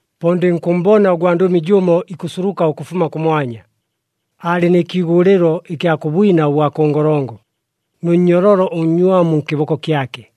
Po ndɨnkʉmmbona ʉgwandʉmi jʉmo ikʉsuluka ʉkʉfuma kʉmwanya, aalɨ nɨ kiigʉlɨlo ɨkya kʉ bwina ʉbwa kʉ ngolongo nʉ nnyololo ʉnnywamu nkɨboko kyake.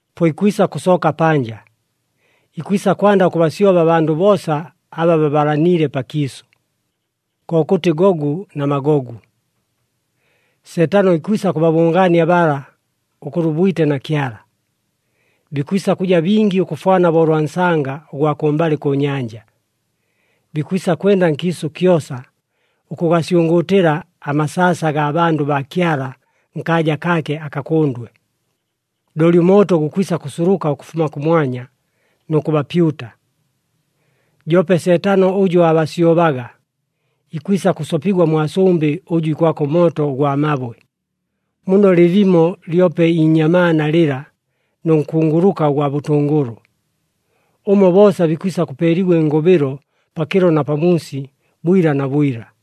Po ikwisa kʉsooka panja, ikwisa kwanda ʉkʉbasyoba abandʉ boosa aba babalaniile pakiisʉ, kokʉtɨ Gogu na Magogu. Seetano ikwisa kʉbabʉngaania bala ʉkʉlwa ʉbwite na Kyala. Bikwisa kʉja bingi ʉkʉfwana bo ʉlwa nsanga ʉgwa kʉmbalɨ kʉ nyanja. Bikwisa kwenda nkiisʉ kyosa, ʉkʉgasyʉngʉʉtɨla amasaasa agaa bandʉ baa Kyala nkaaja kaake akakʉndwe. Looli ʉmooto gukwisa kʉsuluka ʉkʉfuma kʉmwanya nʉ kʉbapyuta. Joope Seetano ʉjʉ aabasyobaga, ikwisa kʉsopigwa mwa sʉmbɨ ʉjʉ ikwaka ʉmooto ʉgwa mabwe, muno lɨlimo lyope iinyamaana lɨla nʉ nkunguluka ʉgwa bʉtʉngʉlʉ. Ʉmo boosa bikwisa kʉpeeligwa ɨngʉbɨlo pakɨlo na pamuusi, bwila na bwila.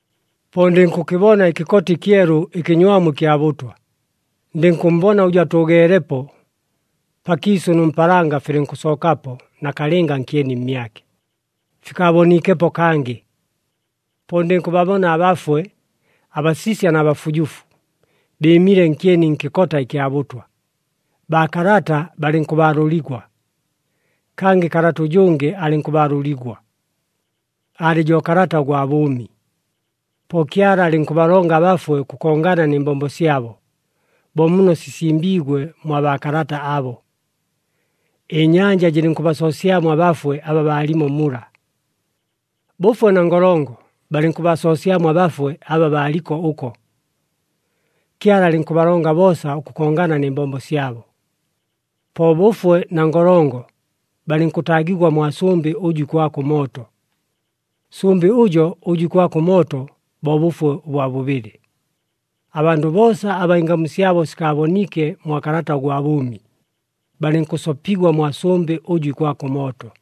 Po ndɨnkʉkɨbona ɨkɨkota ɨkyelu ɨkɨnywamu ɨkya bʉtwa, ndɨnkʉmmbona ʉjʉ atʉʉgeelepo. Pakiisʉ nʉ mpaalanga filɨnkʉsookapo nakalɨnga nkyeni mmyake, fikaaboniikepo kangɨ. Po ndɨnkʉbabona abafwe, abasisya na bafujufu, bɨɨmile nkyeni nkɨkota ɨkya bʉtwa, baakalata balɨnkʉbaalʉligwa. Kangɨ kalata ʉjʉngɨ alɨnkʉbaalʉligwa. Aalɨ jo kalata ʉgwa bʉʉmi. Po Kyala alɨnkʉbalonga abafwe ʉkʉkongana nɨ mbombo syabo, bo muno sisimbiigwe mwa baakalata abo. Ɨnyanja jɨlɨnkʉbasoosyamo abafwe aba baalimo mula. Bʉfwe na Ngolongo balɨnkʉbasoosyamo abafwe aba baaliko ʉko. Kyala alɨnkʉbalonga boosa ʉkʉkongana nɨ mbombo syabo. Po Bʉfwe na Ngolongo balɨnkʉtaagigwa mwa sʉmbɨ ʉjʉ ikwaka ʉmooto. Sʉmbɨ ʉjo ʉjʉ ikwaka ʉmooto, bo bʉfwe ʉbwa bʉbɨlɨ. Abandʉ boosa aba ɨngamu syabo sikaaboniike mwa kalata ʉgwa bʉʉmi, balɨnkʉsopigwa mwa sʉmbɨ ʉjʉ ikwaka ʉmooto.